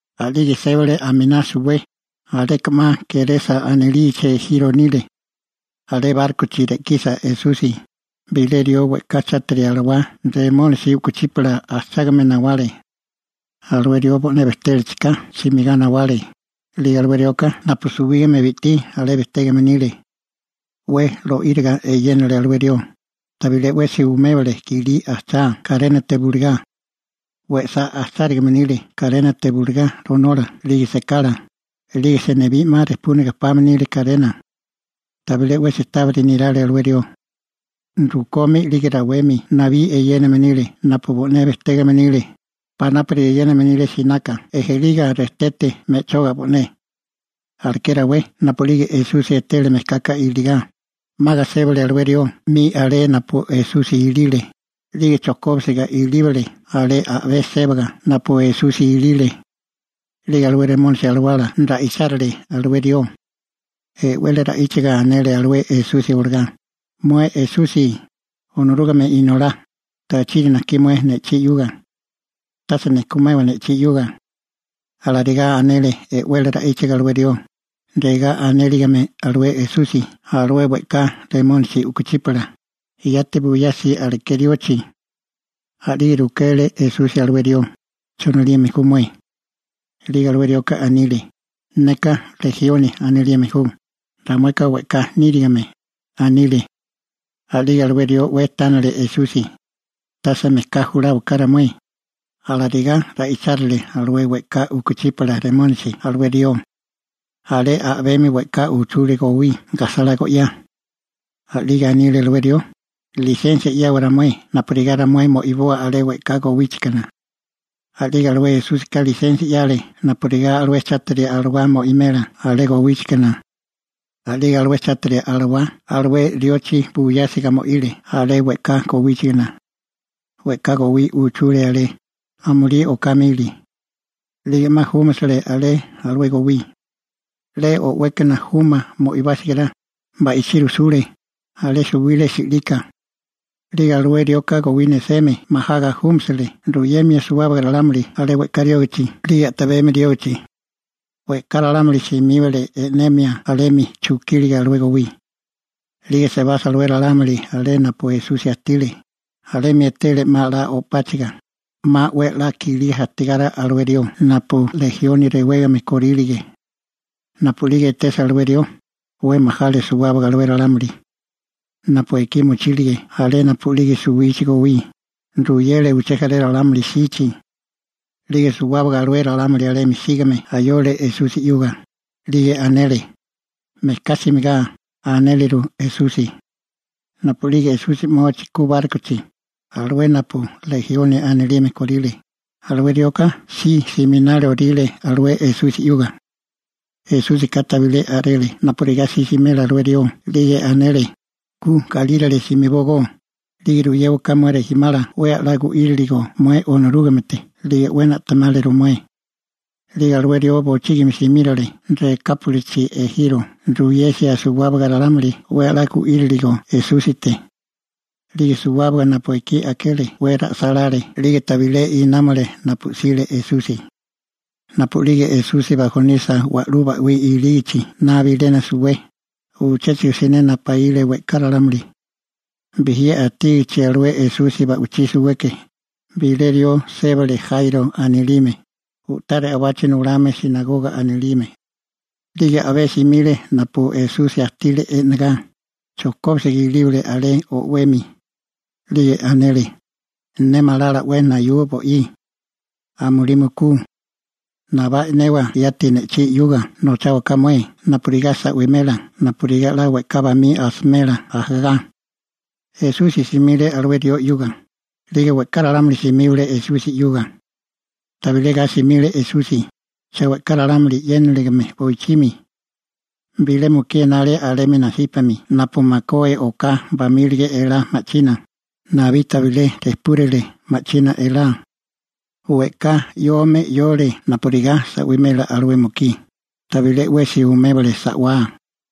A'lige sébale aminá suwé, aleka 'ma Gerasa anilichi ejiro nile. Alé bárkochi re'kisa Esusi, bilé rió we'ká chátiri alawá Remónisi u'kuchípala ajchágame nawale. Alué rió bo'né bejtélachika simigá nawale, 'lige alué rioka napu suwígame bi'tí alé bejtégame nile. 'We lo'íriga eyénale alué rió, tabilé 'wesi umébale i'kilí ajchá karénate bulegá. We'sá ajchárigame nile karénate bulegá ronola 'lige sekala, 'lige senibí 'ma rijpúnaga pame nile karena. Tabilé 'wesi tábiri nirale alué rió. Rukomi 'lige rawemi nabí eyéname nile napu bo'né bejtégame nile, panápuri eyéname nile sinaka ejeliga rejtete me'choga bo'né. Aleké rawé napu'lige Esusi etele mejkaka iligá, 'maga sébale alué rió 'mi alé napu Esusi ilile, 'lige chojkóbisiga ilíbale alé a'bé sébaga napu Esusi ilile. 'Lige alué Remónisi alawala ra'ichárile alué rió. E'wele ra'íchaga anele alué Esusi olagá: ―Mué Esusi, Onorúgame Inolá, ¿tachiri najkí mué ne'chí 'yuga? Tase nijkumewa ne'chí 'yuga. Alarigá anele e'wele ra'íchaga alué rió, regá anéligame alué Esusi alué we'ká remónisi u'kuchípala: ―Yati buyasi aleké riochi. A'lige rukele Esusi alué rió: ―¿Cho anilime ju mué? 'Lige alué rioka anile: ―Neka Lejioni anilime ju, ramueka we'ká nírigime ―anile. A'lige alué rió 'we tánale Esusi: ―¡Tase mejká juláwaka ramué! ―alarigá ra'ichárile alué we'ká u'kuchípala remónisi alué rió. Alé a'bemi we'ká uchule gowí gajsalá go'yá. A'lige anile alué rió: ―Lisensia 'yawa ramué napurigá ramué mo'iboa alé we'ká gowíchigana. A'lige Esúsika lisensia 'yale napurigá alué chátiri alawá mo'imela alé gowíchigana. A'lige alué chátiri alawá alué riochi buyásiga mo'ile alé we'ká gowíchigana. We'ká gowí uchule alé, amulí oká mili. 'Lige 'ma júmasele alé alué gowí. 'Le o'wékana juma mo'ibásale, ba'ichí rujsule, alé suwile si'lika. 'Lige alué rioka gowí neseme majaga júmasele ruyemia suwábaga ralámuli alé we'ká riógichi 'lige a'tabemi riógichi. We'ká ralámuli simíbale e'nemia alemi chukíliga alué gowí. 'Lige sebasa alué ralámuli alé napu Esusi ajtile, alemi etele 'ma 'la o'páchiga, 'ma 'we a'lá kilí ajtígame alué rió napu Lejioni rewégame korílige. Napu'lige etesa alué rió, 'we majale suwábaga alué ralámuli. Napu ekí mochílige alé napu'lige suwichi gowí, ruyele uché jaré ralámuli jsichi. 'Lige suwábaga alué ralámuli alemi sígame ayole Esusi 'yuga, 'lige anele: ―¡Mejká simigá! ―anéleru Esusi. Napu'lige Esusi 'mochi ku bárkochi, alué napu Lejioni anilime kóríle, alué rioka si siminálioríle alué Esusi 'yuga. Esúsika tabilé a'rele napurigá si simela alué rió 'lige anele: ―Ku galírale simibógó, 'lige ruyéwaká mué rijimala 'we a'lá gu'írilirigo mué Onorúgamete 'lige 'we na'temáliru mué. 'Lige alué rió bochígimi simírale Rekápolichi ejiro ruyesia suwábaga ralámuli 'we a'lá gu'írilirigo Esúsite. 'Lige suwábaga napu ekí akele 'we ra'sálále 'lige tabilé námale napu 'sile Esusi. Napu'lige Esusi bajonisa wa'lú ba'wí ilígichi 'na bilena suwé, uchéchigo siné napaíle we'ká ralámuli. Bijí ajtígichi Esusi alé ba'wichí suweke, bilé rió sébale Jairo anilime, u'tá re'obachi nulame «sinagoga» anilime. 'Lige a'bé simile napu Esusi ajtile e'negá, chojkóbisiga ilíbale alé o'wemi. 'Lige anele: ―Ne malala 'we nayua bo'í. Amulí mukú. Nabá e'newa yati ne'chí 'yuga nocháwaká mué napurigá sa'wimela napurigá 'la we'ká bamí asimela ajagá. Esusi simile alué rió 'yuga, 'lige we'ká ralámuli simíbale Esusi 'yuga. Tabilé ga simile Esusi, cha we'ká ralámuli 'yéniligime boichimi. Bilé mukí enale alemi nasípami napu makué oká bamílige elá ma'china, nabí tabilé rejpúrile ma'china elá. We'ká 'yome 'yole napurigá sa'wimela alué mukí, tabilé 'wesi umébale sa'wá,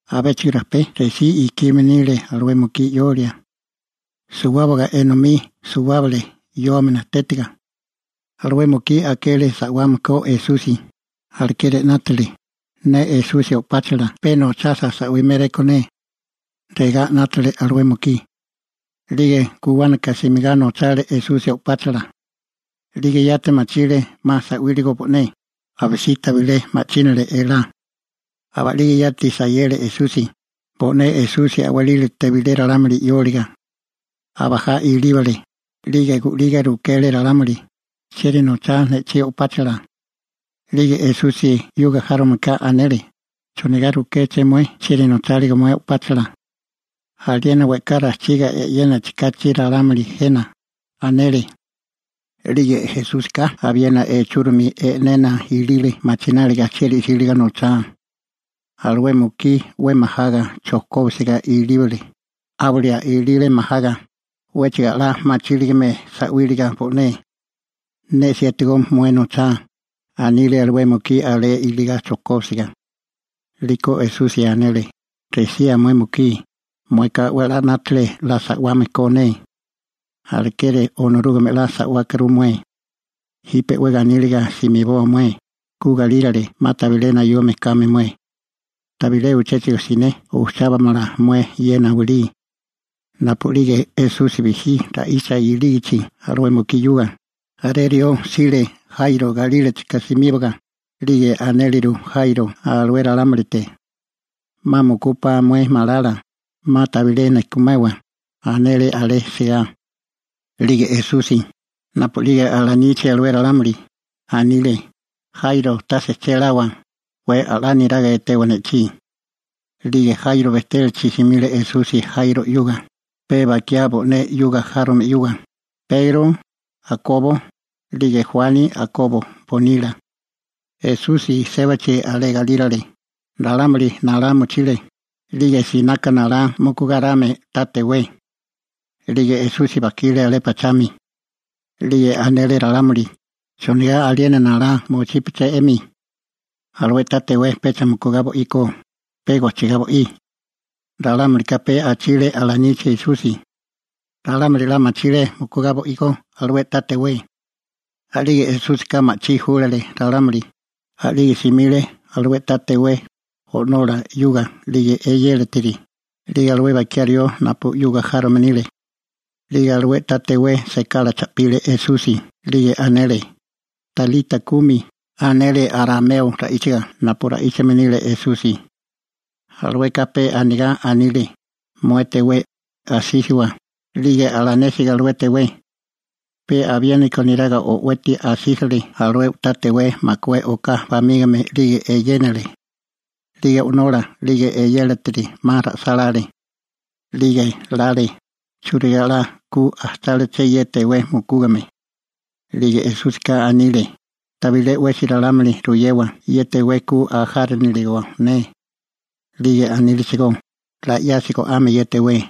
abéchigo rajpé resí ikime nile alué mukí 'yolia. Suwábaga enomí suwábale 'yome najtétiga. Alué mukí akele sa'wame ko Esusi, alekeri 'nátale: «Ne Esusi o'páchala pe nochasa sa'wiméréko ne», regá 'nátale alué mukí. 'Lige guwánaka simigá nochale Esusi o'páchala. 'Lige yati machile 'ma sa'wíliga bo'né, abisí tabilé ma'chínale elá. Aba'lige yati sayele Esusi, bo'né Esusi a'walílate bilé ralámuli sa'wáliga. Abajá ilíbale, 'lige gu'liga rukele ralámuli: ―¿Chieri nochá ne'chí o'páchala? 'Lige Esusi 'yuga járomeka anele: ―¿Chonigá rukéché mué chieri nocháligo mué o'páchala? Aliena we'ká rajchiga e'yénachi kachi ralámuli jena ―anele. 'Lige Esúsika abiena echúromi e'nena ilile machináliga chieri 'síligo nochá. Alué mukí 'we majaga chojkóbisiga ilíbale, 'áwalia ilile majaga, 'wéchigo 'la machíligame sa'wíliga bo'né. ―Ne 'siétigó mué nochá ―anile alué mukí alé iligá chojkóbisiga. 'Liko Esusi anele: ―Resía mué mukí, mueka 'we a'lá 'nátale 'la sa'wame ko ne. Alekeri Onorúgame 'la sa'wákuru mué. Jipe 'we ganíliga simiboa mué ku galírale, 'ma tabilé nayume kame mué. Tabilé uchéchigo siné ujchábamala mué ye nawilí. Napu'lige Esusi bijí ra'icha ilígichi alué mukí 'yuga, jaré rió jsile Jairo galílachika simíbaga, 'lige anéleru Jairo alué ralámulite: ―'Ma mukúpá mué malala, 'ma tabilé nejkumewa ―anele alé sigá. 'Lige Esusi, napu'lige alanichi alué ralámuli, anile: ―Jairo, tase che lawa, 'we a'lá niraga etewa ne'chí. 'Lige Jairo bejtélachi simile Esusi Jairo 'yuga, pe bakiá bo'né 'yuga járome 'yuga: Pegro, Akobo, 'lige Juani Akobo bonila. Esusi sébachi alé galírale, ralámuli nalá mochile, 'lige sinaka nalá 'ma mukugáriká ta tewé. 'Lige Esusi bajkile alé pachami. 'Lige anele ralámuli: ―¿Chonigá aliena nalá mochípeché 'emi? Alué ta tewé pecha mukugá bo'íkó, pe gojchigá bo'í. Ralámulika pe achile alanichi Esusi. Ralámuli 'la machile mukugá bo'igó alué ta tewé. A'lige Esúsika ma'chí júlale ralámuli, a'lige simile alé napu bo'ile ta tewé, alué ta tewé o'nola 'yuga, eyélatiri, 'lige alué bakiá rió napu 'yuga járome nile. 'Lige alué ta tewé sekala cha'pile Esusi 'lige anele: ―Talita kumi ―anele arameo ra'íchaga napu ra'íchame nile Esusi. (Alueka pe anigá anile: «Mué tewé, asísiwa.») 'Lige alanésiga alué tewé, pe abiéniko neraga o'weti asísile alué u'tá tewé makué oká bamígame, 'lige eyénale. 'Lige o'nola 'lige eyélatiri 'ma ra'sálále. 'Lige lale: «¿Churigá 'la ku ajcháleché ye tewé mukúgame?» 'Lige Esúsika anile: ―Tabilé 'wesi ralámuli ruyewa ye tewé ku ajánilirigo ne. 'Lige anílechigó: ―'La 'yasi go'ame ye tewé.